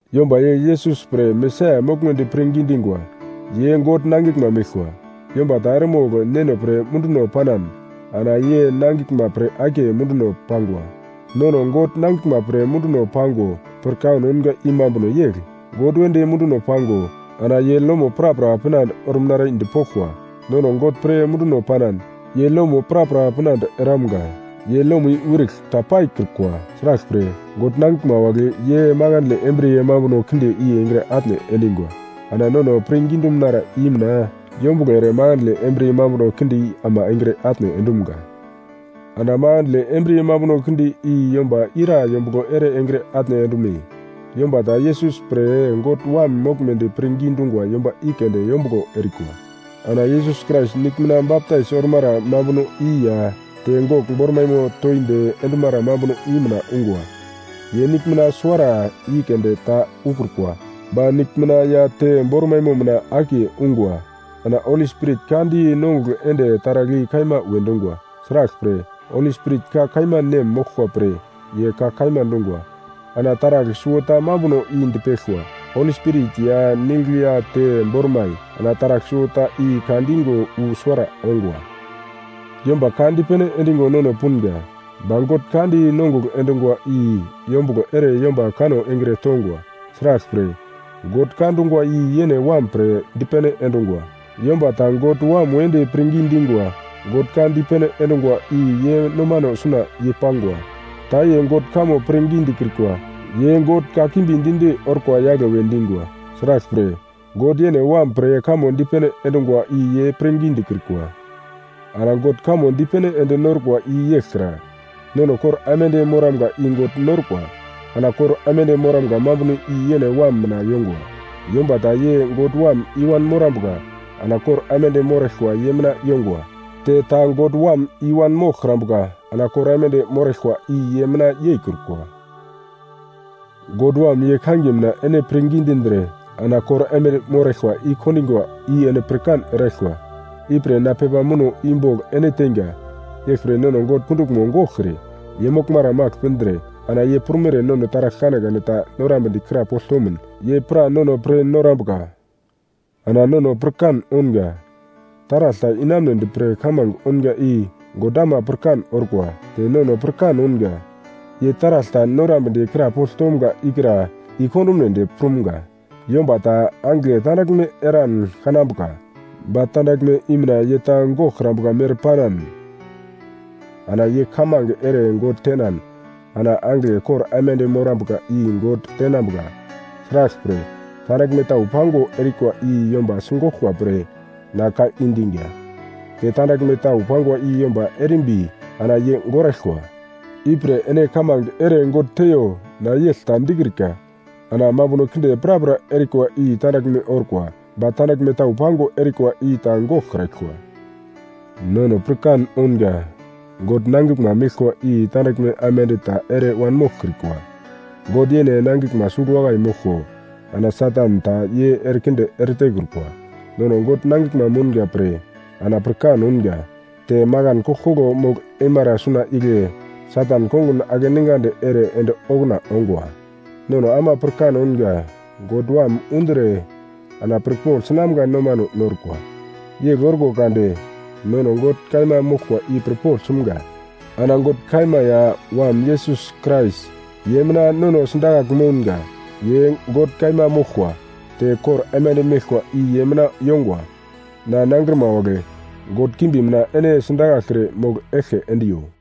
Yomba ye Yesus pre Mesaia moglmedi pirngi dingwa, ye God nangiglma meglkwa. Yomba ta eremogl neno pre munduno panan, ana ye nangiglma pre akiye munduno pangwa. Nono God nangiglma pre munduno pango pirkan ounga i mambuno yegl: God wedi munduno pango ana ye lomo prapra pinande orumnara i dipoglkwa. Nono God pre munduno panan, ye lomo prapra pinande eramga. Ye lomo i wirigl ta paikrukwa. Sraglpre, God nangiglma wagle ye makandle embriye mambuno kinde i engre atne endingwa. Ana nono pirngi dumunara i mina yombuglo ere makandle embriye mambuno kinde i ama engre atne endumga. Ana makandle embriye mambuno kinde i yomba ira yombuglo ere engre atne endume? Yomba ta Yesus pre God Wam moglmedi pirngi dungwa yomba i keunde yombuglo erikwa. Ana Yesus Krais nigl mina baptais ormara mambuno i ya te gogl bormaimo toindi endumara mambuno i mina ungwa. Ye nigl mina suwara i keunde ta ukrukwa, ba nigl mina ya te bormaimo mina akiye ungwa. Ana Holi Spirit ka di nongugl ende taragl i kaima we dungwa. Sraglpre, Holi Spirit ka kaima nem moglkwa pre ye ka kaima dungwa. Ana taragl suwota mambuno i dipeglkwa: Holi Spirit ya nigl ya te bormai, ana taragl suwota i ka digo wu suwara ongwa. Yomba ka dipene endigo nono punga, ba God ka di nongugl endungwa i yombuglo ere yomba kanno engre tongwa. Sraglpre, God ka dungwa i yene Wam pre dipene endungwa. Yomba ta God Wam wedi pirngi dingwa, God ka dipene endungwa i ye nomano suna yei-pangwa. Ta ye God kamo pirngi dikrikwa, ye God kakimbi di-di orkwa yagle we dingwa. Sraglpre, God yene Wam pre kamo dipene endungwa i ye pirngi dikrikwa. Ana God kamo dipene ende norkwa i yegl kra: Nono kor aimande moramga i God norkwa. Ana kor aimande moramga mambuno i yene Wam mina yongwa. Yomba ta ye God Wam i-wan morambuka, ana kor aimande moraglkwa ye mina yongwa. Te ta God Wam i-wan moglkrambuka, ana kor aimande moraglkwa i ye mina yeikrukwa. God Wam ye kangiye mina ene pirngi dindre ana kor aimande moraglkwa i-kondingwa i ene pirkan eraglkwa, ipre na pepa muno i bogl ene teinga. Yeglpre nono God kunduglmo goglkre ye moglmara magl pindre ana ye prumere nono taragl kanekane ta norambedi krapogl tomun, ye pra nono pir norambuka. Ana nono pirkan ounga: Taragl ta inamunedi pre kamange ounga i God ama pirkan orkwa. Te nono pirkan ounga: Ye taragl ta norambedi krapogl tomga ikra i-kondumnedi prumga. Yomba ta angigle tandaglme eran kanambuka, ba tandaglme i mina ye ta goglkrambuka mere panan, ana ye kamange ere God tenan ana angigle kor aimande morambuka i God tenambuka. Sraglpre, tandaglme tau pango erikwa i yomba sigoglkwa pre na ka i diga. Te tandaglme tau pangwa i yomba erimbi ana ye goraglkwa. Ipre ene kamange ere God teiyo na yegl ta dikrika. Ana mambuno kinde prapra erikwa i tandaglme orkwa, ba tandaglme tau pango erikwa i ta goglkraglkwa. Nono pirkan ounga, God nangiglma meglkwa i tandaglme aimande ta ere wanmoglkrikwa. God yene nangiglma sugl wakai moglko ana Satan ta ye erekinde eretekrukwa. Nono God nangiglma mounga pre ana pirkan ounga, te makan koglkoglo mogl eimara suna igle Satan kongun akeningandi ere ende okuna ongwa. Nono ama pirkan ounga God Wam undre ana pirpogl sinamga nomano norkwa. Yegl orko kade nono God kaima moglkwa i pirpogl sumga. Ana God kaima ya Wam Yesus Krais, ye mina nono sidakagl mounga. Ye God kaima moglkwa, te kor aimande meglkwa i ye mina yongwa. Na nangrima wagle, god kimbi mina ene sidakaglkre mogl eglke endiyo.